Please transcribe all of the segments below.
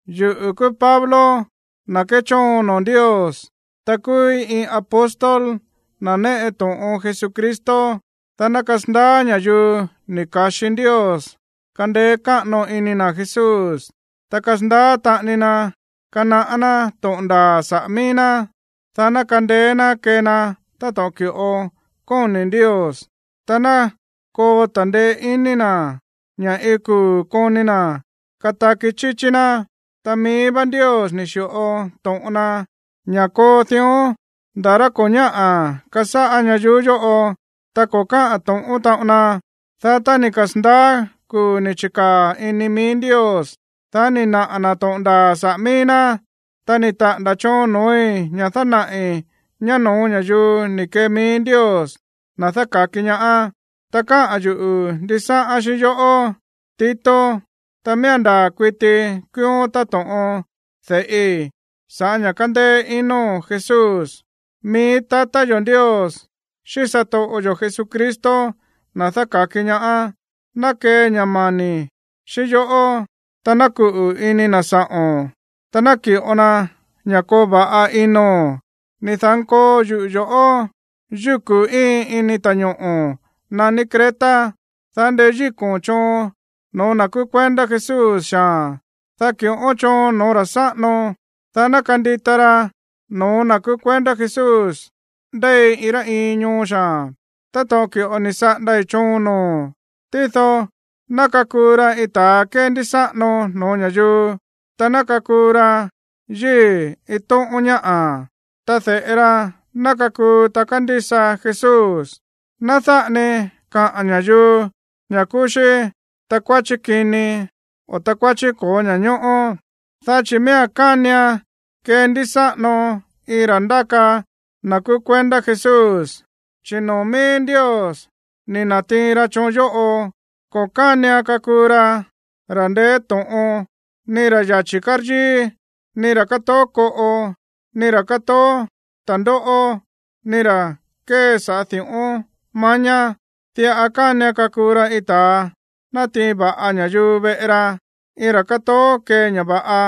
Yuꞌu̱ kúú Pablo, na̱ kéchóon noo̱ Ndios, ta kúúí iin apóstol, na̱ néꞌe to̱ꞌon Jesucristo, dá ná kasandaá ña̱yuu ni̱ ka̱xi Ndios kandeé káꞌano iní na̱ Jesús, ta kasandaá taꞌani na kanaꞌá ná to̱ꞌon ndaa̱ saꞌa̱ mií ná, dá ná kandeé ná kee na táto̱ꞌon ki̱ꞌo kóni̱ Ndios, ta ná koo ta̱ndeé iní na̱ ña̱ iin kuu̱ koni na̱ kataki chíchí ná. Ta mií vá Ndios ni̱ xi̱ꞌo to̱ꞌon na ña̱ koo dión ndá rá ko̱ ñáꞌa̱ kasáꞌá ñayuú yóꞌo, ta ko̱ káꞌa̱n to̱ꞌón taꞌon na. Dá tá ni̱ kasa̱ndaá kuu̱ ni̱ chi̱kaa̱ ini mií Ndios, dá ni̱ naꞌa̱ na̱ to̱ꞌon ndaa̱ saꞌa̱ mií ná. Ta ni̱ taꞌa̱nda̱ choon noo̱í ña̱ dánaꞌi̱ ñá no̱ó ña̱yuu ni̱ kee mií Ndios, na̱ dáka̱ki ñaá. Ta káꞌa̱n yuꞌu̱ ndisáꞌán xíꞌín yoꞌó, Tito. Ta miía̱n ndaa̱ kuiti kúúón táto̱ꞌon de̱ꞌi sa̱ꞌá ña̱ kándéé ino̱n Jesús. Mií tatá yo̱ Ndios xíꞌín satoꞌo yo̱ Jesucristo, na̱ dáka̱ki ñaá, ná kee ña̱ mani̱ xíꞌín yoꞌó, ta ná kuꞌu̱ ini na̱ sa̱ꞌo̱n, ta ná ki̱ꞌo na ña̱ koo va̱ꞌa ino̱n. Ni̱ da̱nkoo yuꞌu̱ yo̱ꞌó yúku̱ íin ini ta̱ñoꞌo̱ naní Creta, dá ndeyíko̱n choon no̱ó na̱ kúú kuendá Jesús xaa̱n, dá ki̱ꞌón choon no̱ó ra̱ sáꞌano, dá ná kandita ra no̱ó na̱ kúú kuendá Jesús ndéi iin rá iin ñoo xaa̱n táto̱ꞌon ki̱ꞌo ni̱ saꞌándái̱ choon noo̱o̱n. Tído ná kakuu ra iin ta̱a kéndísáꞌano no̱ó ña̱yuu, ta ná kakuu ra yíi̱ iin tóꞌón ñáꞌa̱, ta de̱ꞌe ra ná kakuu ta kándísa Jesús. Ná dáꞌa ni kaꞌa̱n ña̱yuu ña̱ kúú xí takuáchí kini, o takuáchí ko̱ó ña̱ñóꞌó. Dá chi̱ miía̱n kánian kendísáꞌano iin ra̱ ndáka na̱ kúú kuendá Jesús, chi̱ noo̱ mií Ndios ni̱ na̱tiin ra choon yóꞌo. Ko̱ kánian kakuu ra ra̱ ndeé to̱ꞌon, ni ra̱ yachi̱ káryíí, ni ra̱ kátoó koꞌo, ni ra̱ kátoó ta̱ndóꞌó, ni ra̱ kée saꞌa̱ di̱ꞌón mañá. Diꞌa kánian kakuu ra iin ta̱a natiin va̱ꞌa ña̱yuu veꞌe ra, iin ra̱ kátoó kée ña̱ va̱ꞌa,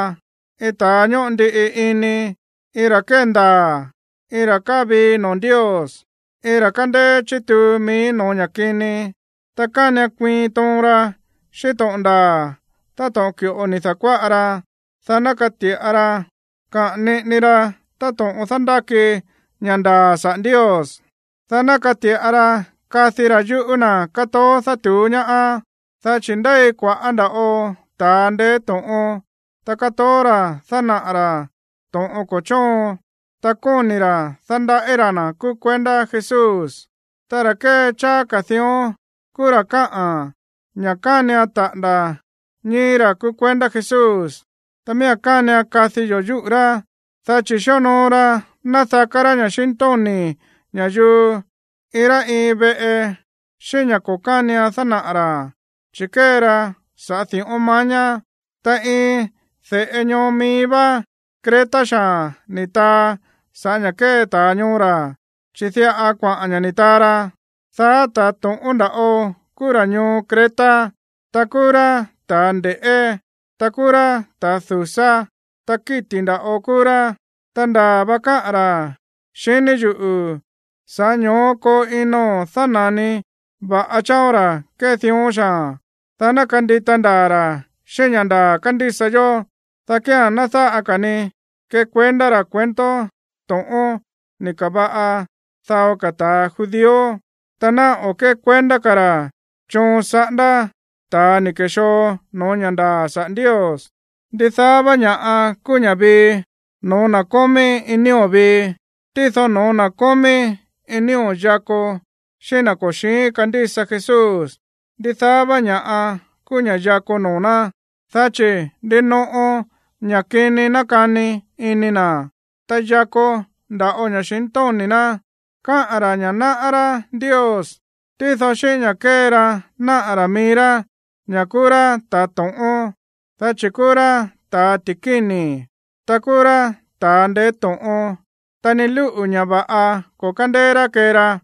iin ta̱a ñóꞌo ndiꞌi ini, iin ra̱ kéndaa̱, iin ra̱ káa vii noo̱ Ndios, iin ra̱ kándéé chituu mií no̱ó ña̱ kini. Ta kánian kuiin toon ra xíꞌín to̱ꞌon ndaa̱ táto̱ꞌon ki̱ꞌo ni̱ da̱kuáꞌa ra, dá ná kati̱ꞌa ra kaꞌa̱n niꞌini ra táto̱ꞌon dándáki ña̱ ndaa̱ saꞌa̱ Ndios, dá ná kati̱ꞌa ra kadi ra̱ yúꞌu̱ na̱ kátoó dátu̱ú ñaá. Dá chi̱ ndéi kua̱ꞌá nda̱ꞌo ta̱a ndeé to̱ꞌon, ta kátoó ra̱ dánaꞌa̱ ra̱ to̱ꞌon ko̱ chóon, ta kóni̱ ra̱ dándaꞌí ra̱ na̱ kúú kuendá Jesús. Ta ra̱ kée cháá ka̱ dión kúú ra̱ káꞌa̱n ña̱ kánian taꞌa̱nda̱ ñíi̱ ra̱ kúú kuendá Jesús. Ta miía̱n kánian kadi yo̱ yúꞌu̱ rá, dá chi̱ xíonoo ra nádaká rá ña̱xintóni̱ ña̱yuu iin rá iin veꞌe xíꞌín ña̱ ko̱ kánian dánaꞌa̱ ra̱, chi̱ kée ra saꞌa̱ di̱ꞌón mañá. Ta iin de̱ꞌe ñoo mií vá Creta xaa̱n ni̱ taa saꞌa̱ ña̱ kée ta̱a ñoo ra̱, chi̱ diꞌa kuaꞌa̱n ña̱ ni̱ taa ra: “Daá ta̱ to̱ꞌón nda̱ꞌo kúú ra̱ ñoo Creta, ta kúú rá ta̱ nde̱ꞌé, ta kúú rá ta̱ du̱sá, ta kíti̱ nda̱ꞌo kúú rá.” Ta ndaa̱ va káꞌa̱n ra̱, xiní yuꞌu̱. Sa̱ꞌá ño̱ó koo ino̱n dána̱ni va̱ꞌa chááón ra̱ kée dión xaa̱n, dá ná kandita ndaa̱ ra̱ xíꞌín ña̱ ndaa̱ kándísa yó, dá kía̱n ná dáꞌa ka̱ ni kekuendá ra̱ cuento to̱ꞌón ni̱ ka̱va̱ꞌa dao ta̱ Judío, ta ná o̱ kékuendá ka̱ ra̱ choon saꞌándá ta̱a ni̱ ke̱xoo no̱ó ña̱ ndaa̱ sa̱ꞌá Ndios. Ndidaá vá ña̱ꞌa kúú ña̱ꞌa vii no̱ó na̱ kómí iin nío̱ vii. Tído no̱ó na̱ kómí iin nío̱ yakó xíꞌín na̱ ko̱ xi̱ín kándísa Jesús, ndidaá vá ña̱ꞌa kúú ña̱ꞌa yakó noo̱ ná, dá chi̱ ndinoꞌo ña̱ kini nákani ini na̱, ta yakó nda̱ꞌo ña̱xintóni̱ ná. Kaá ra̱ ña̱ náꞌá rá Ndios, tído xíꞌín ña̱ kée ra náꞌa̱ ra̱ mií rá ña̱ kúú rá ta̱ to̱ꞌón, dá chi̱ kúú rá ta̱ ti̱kíni̱, ta kúú rá ta̱a ndeé to̱ꞌon, ta ni lúꞌu̱ ña̱ va̱ꞌa ko̱ kándéé rá kée ra.